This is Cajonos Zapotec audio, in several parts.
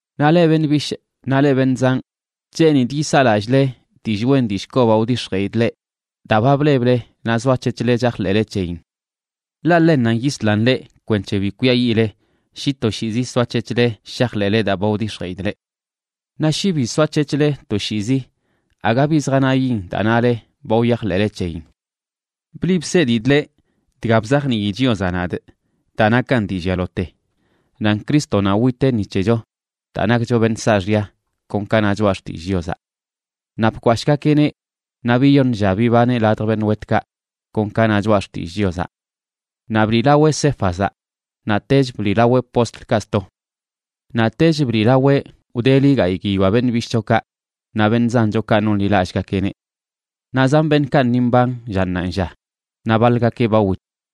Naꞌ leꞌ beṉꞌ bishꞌ naꞌ leꞌ beṉꞌ zanꞌ, cheenidꞌ yisaa lallꞌle dillꞌ wen dillꞌ kobaꞌ wdix̱jeꞌidꞌ leꞌ daa ba bleble naꞌ zoac̱hec̱hle chajḻeꞌle c̱heyin. Ḻaꞌ ḻennanꞌ yislan leꞌ kwenc̱he bi kwiayiꞌle shi toshiizi soac̱hec̱hle shajḻeꞌle daa ba wdix̱jeꞌidꞌ leꞌ. Naꞌ shi bi soac̱hec̱hle toshiizi aga bi zjanayin daa nale ba wyajḻeꞌle c̱heyin. Bliꞌ bsedidꞌ leꞌ dga bzajnii Chiozaꞌ nadꞌ daa nakan dii llialote: nan Crístonaꞌ witeꞌ ni c̱hecho daa nakcho beṉꞌ saaxya, kon ka na Choꞌa Xtillꞌ Chiozaꞌ. Naꞌ bkwashꞌgakeꞌneꞌ naꞌ biyoṉ lla bibaneꞌ ladj beṉꞌ wetkaꞌ, kon ka na Choꞌa Xtillꞌ Chiozaꞌ. Naꞌ bliꞌlaweꞌ Céfazaꞌ,a naꞌtech bliꞌlaweꞌ postlkaꞌ sto. Naꞌtech bliꞌlaweꞌ wdeli gayꞌ guiyoa beṉꞌ bishꞌchokaꞌ naꞌ beṉꞌ zanchokaꞌ nonḻilallꞌgakeꞌneꞌ. Naꞌ zan beṉꞌkaꞌ ni mban lla ṉaanlla, naꞌ baḻgakeꞌ ba wit.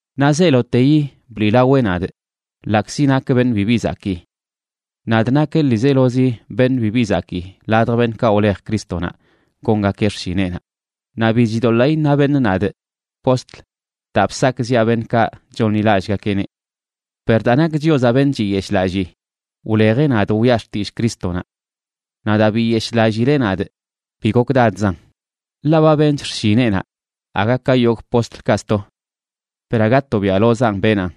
Naꞌ zeeloteyi bliꞌlaweꞌ nadꞌ, ḻaꞌkzi nakꞌ beṉꞌ bibi zakii. Nadꞌ nakꞌ ḻiizelozi beṉꞌ bibi zakii ladj beṉꞌkaꞌ wlej Crístonaꞌ gongakeꞌ xshineꞌnaꞌ, naꞌ bi chidoḻaa iṉa beṉꞌ nadꞌ “postl”, daa bsakꞌziꞌa beṉꞌkaꞌ chonḻilallꞌgakeꞌneꞌ. Per daa nak Chiozaꞌ beṉꞌ chiyeshꞌlallii, wlejeꞌ nadꞌ wiꞌa xtillꞌ Crístonaꞌ. Naꞌ daa biyeshlallileꞌ nadꞌ bi gokdadzan, ḻaꞌ ba benchꞌ xshineꞌnaꞌ aga ka yogꞌ postlkaꞌ sto. Per aga tobiaꞌlozanꞌ benaꞌn,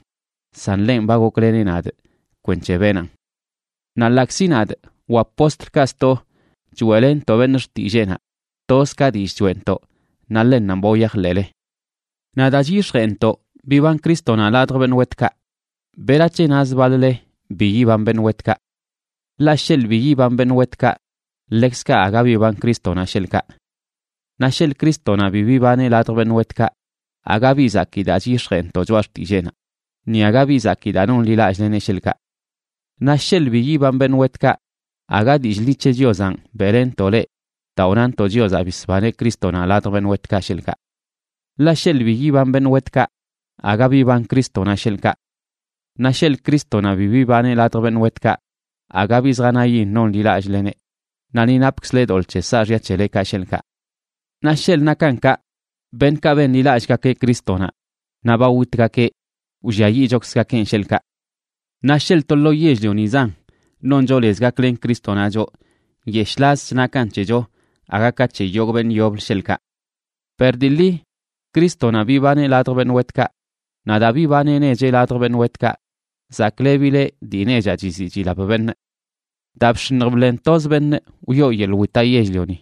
san ḻenꞌ ba gokleneꞌ nadꞌ kwenc̱he benaꞌn. Naꞌ ḻaꞌkzi nadꞌ wa postlkaꞌ sto choeꞌlenntoꞌ beṉꞌ xtilleenaꞌ, toz ka dillꞌ choeꞌntoꞌ, naꞌ ḻennanꞌ ba wyajḻeꞌle. Naꞌ daa chyix̱jeꞌntoꞌ biban Crístonaꞌ ladj beṉꞌ wetkaꞌ, ¿berac̱he nazə baḻ-le bi yiban beṉꞌ wetkaꞌ? Ḻaꞌ sheḻꞌ bi yiban beṉꞌ wetkaꞌ, ḻekzkaꞌ aga biban Crístonaꞌ sheḻꞌkaꞌ. Naꞌ sheḻꞌ Crístonaꞌ bi bibaneꞌ ladj beṉꞌ wetkaꞌ, aga bi zakii daa chyix̱jeꞌntoꞌ choꞌa xtilleenaꞌ, ni aga bi zakii daa nonḻilallꞌleneꞌ, sheḻꞌkaꞌ. Naꞌ sheḻꞌ bi yiban beṉꞌ wetkaꞌ, aga dillꞌ ḻi c̱he Chiozanꞌ beꞌlenntoꞌ leꞌ daa wnantoꞌ Chiozaꞌ bisbaneꞌ Crístonaꞌ ladj beṉꞌ wetkaꞌ, sheḻꞌkaꞌ. Ḻaꞌ sheḻꞌ bi yiban beṉꞌ wetkaꞌ, aga biban Crístonaꞌ, sheḻꞌkaꞌ. Naꞌ sheḻꞌ Crístonaꞌ bi bibaneꞌ ladj beṉꞌ wetkaꞌ, aga bi zjanayin nonḻilallꞌleneꞌ, naꞌ ni napkzle doḻꞌ c̱he saaxya c̱helekaꞌ, sheḻꞌkaꞌ. Naꞌ sheḻꞌ nakan kaꞌ, beṉꞌkaꞌ benḻilallꞌgakeꞌ Crístonaꞌ naꞌ ba witgakeꞌ, wlliayiꞌchokzgakenꞌ, sheḻꞌkaꞌ. Naꞌ sheḻꞌ to lo yell-lionizan noncho lez gaklen Crístonaꞌ choꞌ, nyeshꞌlazch nakan c̱hecho aga ka c̱he yogꞌ beṉꞌ yoblə, sheḻꞌkaꞌ. Per dii ḻi Crístonaꞌ bibaneꞌ ladj beṉꞌ wetkaꞌ, naꞌ daa bibaneꞌ necheꞌ ladj beṉꞌ wetkaꞌ zaklebileꞌ dii nechaꞌ chiziꞌ chilap beṉꞌ. Daa bx̱iṉj bḻen toz beṉꞌ, wyoo yeḻꞌ witaꞌ yell-lioni,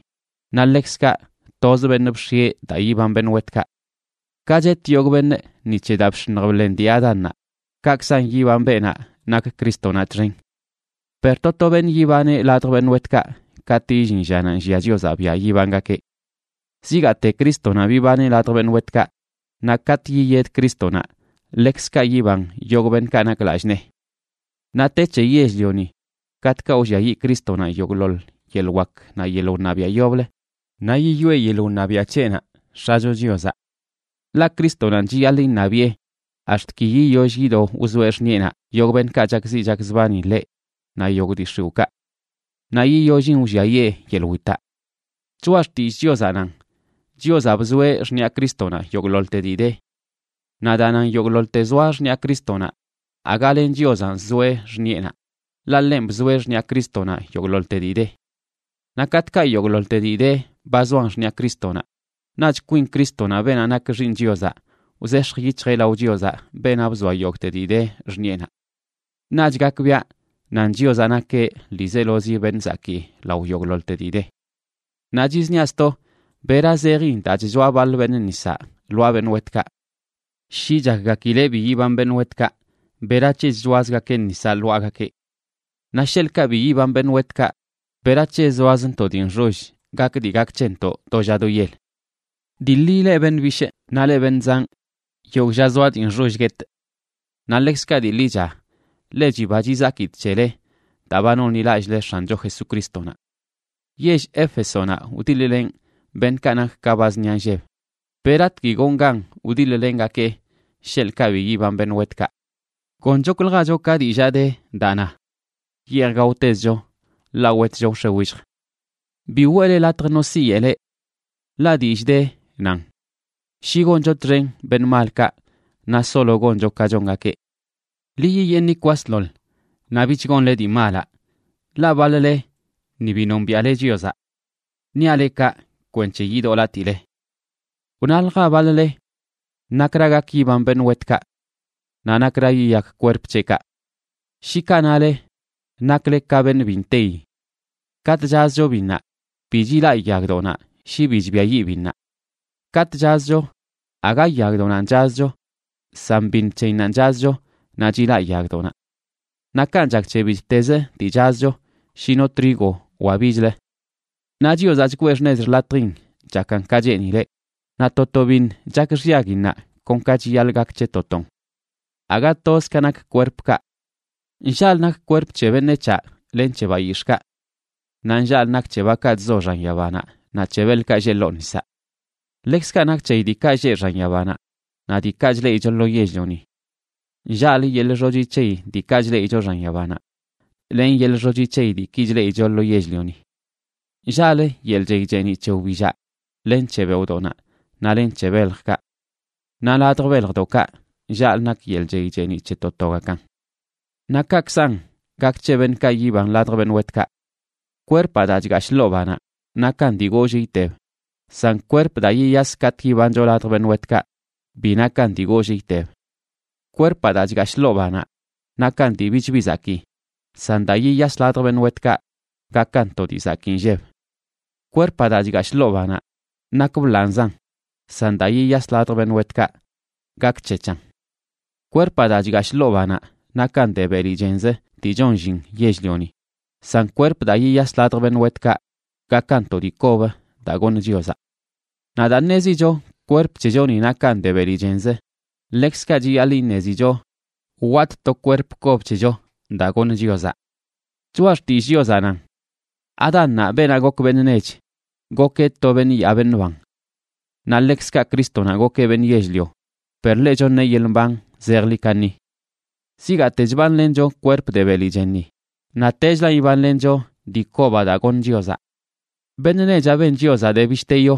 naꞌ ḻekzkaꞌ toz beṉꞌ bx̱ieꞌ daa yiban beṉꞌ wetkaꞌ. Ka chet yogꞌ beṉꞌ ni c̱he daa bx̱iṉj bḻen dii Adánnaꞌ, kaꞌkzan yiban beenaꞌ nak Crístonaꞌ txen. Per to to beṉꞌ yibaneꞌ ladj beṉꞌ wetkaꞌ katꞌ illin llanaꞌ nllia Chiozaꞌ biaꞌ yibangakeꞌ. Zigaate Crístonaꞌ bibaneꞌ ladj beṉꞌ wetkaꞌ, naꞌ katꞌ yiyed Crístonaꞌ, ḻekzkaꞌ yiban yogꞌ beṉꞌkaꞌ nak lallꞌ nee. Naꞌ te c̱he yell-lioni katꞌkaꞌ wlliayiꞌ Crístonaꞌ yogꞌḻoḻ yeḻꞌ wak naꞌ yeḻꞌ wṉabiaꞌ yoblə, naꞌ yiyoꞌe yeḻꞌ wṉabiaꞌ c̱heꞌnaꞌ X̱acho Chiozaꞌ. Ḻaꞌ Crístonanꞌ chiyaḻꞌ iṉabiꞌe ax̱t ki yiyoll yido wzoeꞌ xṉiꞌenaꞌ yogꞌ beṉꞌkaꞌ chakziꞌ chakzbani ḻeꞌ naꞌ yogꞌ dii x̱iwꞌkaꞌ. Naꞌ yiyollin, wlliayee yeḻꞌ witaꞌ. Choꞌa xtillꞌ Chiozaꞌ nan Chiozaꞌ bzoeꞌ xṉiꞌa Crístonaꞌ yogꞌḻoḻte dii de. Naꞌ daa nan yogꞌḻoḻte zoa xṉiꞌa Crístonaꞌ, aga len Chiozanꞌ zoeꞌ xṉiꞌenaꞌ, ḻaꞌ ḻenꞌ bzoeꞌ xṉiꞌa Crístonaꞌ yogꞌḻoḻte dii de. Naꞌ katꞌkaꞌ yogꞌḻoḻte dii de ba zoan xṉiꞌa Crístonaꞌ, naꞌch kwin Crístonaꞌ, beenaꞌ nak Xiiṉ Chiozaꞌ, wzex̱j yic̱hjeꞌ lao Chiozaꞌ, beenaꞌ bzoa yogꞌte dii de xṉiꞌenaꞌ. Naꞌch gakbiaꞌ nan Chiozaꞌ nakeꞌ ḻiizelozi beṉꞌ zakii lao yogꞌḻoḻte dii de. Naꞌ chizniaꞌ sto, ¿bera zejin daa chchoa baḻ beṉꞌ nisaꞌ lwaa beṉꞌ wetkaꞌ? Shi chakgakileꞌ bi yiban beṉꞌ wetkaꞌ, ¿berac̱he chchoazgakeꞌ nisaꞌ lwaagakeꞌ? Naꞌ sheḻꞌkaꞌ bi yiban beṉꞌ wetkaꞌ ¿berac̱he zoazntoꞌ dii nxoll gak dii gak c̱hentoꞌ do lla do yel? Dii ḻi, leꞌ beṉꞌ bishꞌ naꞌ leꞌ beṉꞌ zanꞌ, yogꞌ lla zoaꞌ dii nxoll guetꞌ. Naꞌ ḻekzkaꞌ dii ḻicha ḻe chiba chizakidꞌ c̱hele daa ba nonḻilallꞌle X̱ancho Jesucrístonaꞌ. Yell Éfesonaꞌ wdiḻ-lenꞌ beṉꞌkaꞌ nak ka ba zṉia nlleb, ¿beratgui gonꞌ gan wdiḻ-lengakee sheḻꞌkaꞌ bi yiban beṉꞌ wetkaꞌ? Gonchokljacho ka dillaa de daa na: “Yeej gaotezcho ḻaꞌ wetcho wx̱e willj.” Bi weꞌle latj no siyeꞌ leꞌ. Ḻaꞌ dillꞌ de, nan: “Shi goncho txen beṉꞌ malkaꞌ naꞌ solo goncho ka chongakeꞌ.” Ḻi yiyeeṉi kwasḻoḻ naꞌ bich gonle dii malaꞌ, ḻaꞌ baḻ-le ni bi nombiaꞌle Chiozaꞌ. Niaꞌ leꞌ kaꞌ kwenc̱he yidoꞌlatile. Wnalja baḻ-le: “¿Nakra gak yiban beṉꞌ wetkaꞌ? Naꞌ ¿Nakra yiyak kwerp c̱heꞌkaꞌ?” Shi kaꞌ nale, nakle ka beṉꞌ bi nteyi. Katꞌ chazcho biṉnaꞌ, bi chilaꞌ yagdoꞌnaꞌ shi bi chbiayiꞌ biṉnaꞌ. Katꞌ chazcho, aga yagdoꞌnanꞌ chazcho, san biṉ c̱heyinnanꞌ chazcho, naꞌ chilaꞌ yagdoꞌnaꞌ. Naꞌ kanꞌ chak c̱he bittezə dii chazcho, shi no trigo wa bichlə. Naꞌ Chiozaꞌ chgwee xṉez xḻatjin chakan ka cheenileꞌ, naꞌ to to biṉ chak xyaguinnaꞌ kon ka chiyaḻꞌ gak c̱he to ton. Aga toz ka nak kwerpkaꞌ. Nllaꞌlə nak kwerp c̱he beṉec̱haꞌ len c̱he bayix̱ꞌkaꞌ. Naꞌ nllaꞌlə nak c̱he bakaꞌ chzo xan yabanaꞌ naꞌ c̱he beḻkaꞌ lleꞌ ḻoo nisaꞌ. Ḻekzkaꞌ nak c̱heyi diikaꞌ lleꞌ xan yabanaꞌ naꞌ diikaꞌ chleꞌicho lo yell-lioni. Nllaꞌlə yeḻꞌ xochi c̱heyi diikaꞌ chleꞌicho xan yabanaꞌ len yeḻꞌ xochi c̱heyi diiki chleꞌicho lo yell-lioni. Nllaꞌlə yeḻꞌ chey cheeniꞌ c̱he wbillaꞌ len c̱he beoꞌdoꞌnaꞌ naꞌ len c̱he beljkaꞌ. Naꞌ ladj beljdoꞌkaꞌ nllaꞌlə nak yeḻꞌ chey cheeniꞌ c̱he to togakan. Naꞌ kaꞌkzan gak c̱he beṉꞌkaꞌ yiban ladj beṉꞌ wetkaꞌ. Kwerpaꞌ daa chgashꞌ ḻoo banaꞌ nakan dii goollꞌ iteb, san kwerp daa yiyas katꞌ yibancho ladj beṉꞌ wetkaꞌ bi nakan dii goollꞌ iteb. Kwerpaꞌ daa chgashꞌ ḻoo banaꞌ nakan dii bichbi zakii, san daa yiyas ladj beṉꞌ wetkaꞌ gakan to dii zakii nlleb. Kwerpaꞌ daa chgashꞌ ḻoo banaꞌ nak bḻanꞌzan, san daa yiyas ladj beṉꞌ wetkaꞌ gakc̱hec̱han. Kwerpaꞌ daa chgashꞌ ḻoo banaꞌ nakan de beli chenzə dii chon llin yell-lioni, san kwerp daa yiyas ladj beṉꞌ wetkaꞌ gakan to dii kob daa goṉ Chiozaꞌ. Naꞌ daa ṉezicho kwerp c̱hechoni nakan de beli chenzə, ḻekzkaꞌ chiyaḻꞌ iṉezicho watꞌ to kwerp kob c̱hecho daa goṉ Chiozaꞌ. Choꞌa Xtillꞌ Chiozaꞌ nan: “Adánnaꞌ, beenaꞌ gok beṉꞌ nech, gokeꞌ to beṉꞌ yaa beṉꞌ ban.” Naꞌ ḻekzkaꞌ Crístonaꞌ gokeꞌ beṉꞌ yell-lio, per ḻeꞌ choṉeꞌ yeḻꞌ mban zejḻi kaṉi. Zigaate chbanlencho kwerp de beli chenni, naꞌtechlan ibanlencho dii kobaꞌ daa goṉ Chiozaꞌ. Beṉꞌ nechaꞌ ben Chiozaꞌ de bishte yo,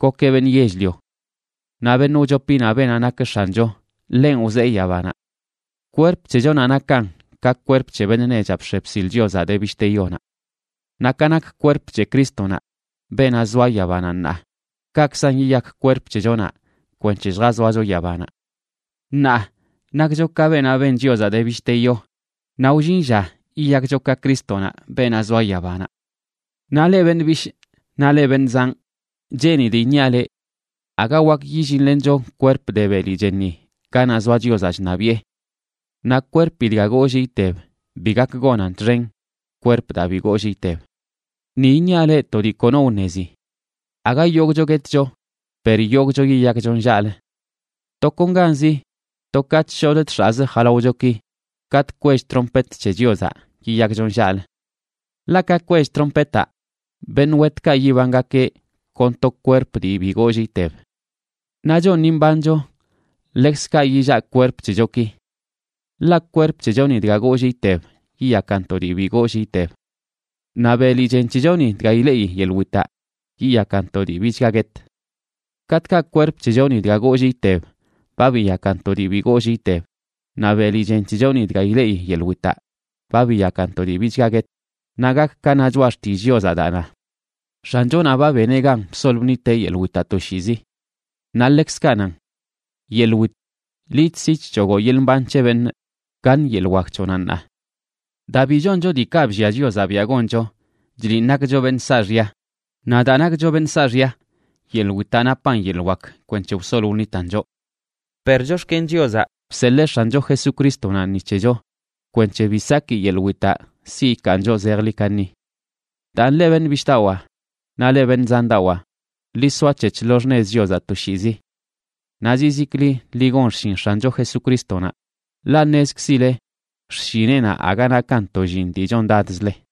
gokeꞌ beṉꞌ yell-lio. Naꞌ beṉꞌ wchopinaꞌ, beenaꞌ nak X̱ancho, ḻenꞌ wzee yabanaꞌ. Kwerp c̱hechonaꞌ nakan ka kwerp c̱he beṉꞌ nechaꞌ bx̱e bsil Chiozaꞌ de bishte yonaꞌ. Naꞌ ka nak kwerp c̱he Crístonaꞌ, beenaꞌ zoa yabanaꞌ ṉaa, kaꞌkzan yiyak kwerp c̱hechonaꞌ kwenc̱he lljazoacho yabanaꞌ. Ṉaa nakcho ka beenaꞌ ben Chiozaꞌ de bishte yo, naꞌ wllin lla yiyakcho ka Crístonaꞌ, beenaꞌ zoa yabanaꞌ. Naꞌ leꞌ beṉꞌ bishꞌ naꞌ leꞌ beṉꞌ zanꞌ, cheenidꞌ iṉiaꞌ leꞌ: Aga wak yillinlencho kwerp de beli chenni ganaꞌ zoa Chiozaꞌ chṉabiꞌe. Naꞌ kwerpi dga goollꞌ iteb bi gak gonan txen kwerp daa bi goollꞌ iteb. Ni iṉiaꞌ leꞌ to dii kono wṉezi: aga yogꞌcho guetcho, per yogꞌcho yiyakcho nllaꞌlə. Tokonganzi, to ka chshodꞌ chx̱aꞌz jalaochoki, katꞌ kwell trompet c̱he Chiozaꞌ, yiyakcho nllaꞌlə. Ḻaꞌ ka kwell trompetaꞌ, beṉꞌ wetkaꞌ yibangakeꞌ kon to kwerp dii bi goollꞌ iteb. Naꞌ choꞌ ni mbancho, ḻekzkaꞌ yillaꞌ kwerp c̱hechoki. Ḻaꞌ kwerp c̱hechoni dga goollꞌ iteb, yiyakan to dii bi goollꞌ iteb. Naꞌ beli chen c̱hechoni dga ileꞌi yeḻꞌ witaꞌ, yiyakan to dii bichga guet. Katꞌkaꞌ kwerp c̱hechoni dga goollꞌ iteb ba biyakan to dii bi goollꞌ iteb, naꞌ beli chen c̱hechoni dga ileꞌi yeḻꞌ witaꞌ ba biyakan to dii bichga guet, naꞌ gak ka na Choꞌa Xtillꞌ Chiozaꞌ daa na: “X̱anchonaꞌ ba beneꞌ gan bsol bṉiteꞌ yeḻꞌ witaꞌ toshiizi.” Naꞌ ḻekzkaꞌ nan: “Yeḻꞌ wit, liꞌ chsi chc̱hogoꞌ yeḻꞌ mban c̱he beṉꞌ, ¿gaṉ yeḻꞌ wak c̱hoꞌnaꞌ ṉaa?” Daa bi choncho diikaꞌ bllia Chiozaꞌ biaꞌ goncho chliꞌn nakcho beṉꞌ saaxya, naꞌ daa nakcho beṉꞌ saaxya, yeḻꞌ witaꞌ napan yeḻꞌ wak kwenc̱he wsol wṉitan choꞌ. Per chox̱ken Chiozaꞌ bseḻee X̱ancho Jesucrístonaꞌ ni c̱hecho kwenc̱he bi saki yeḻꞌ witaꞌ siꞌ ikaan choꞌ zejḻi kaṉi. Daan, leꞌ beṉꞌ bishꞌdawaa naꞌ leꞌ beṉꞌ zandawaa, ḻi soac̱hec̱h lo xṉez Chiozaꞌ toshiizi. Naꞌ zizikli ḻi gon xshin X̱ancho Jesucrístonaꞌ, ḻaꞌ ṉezkzile xshineꞌnaꞌ aga nakan to llin dii chondadzle.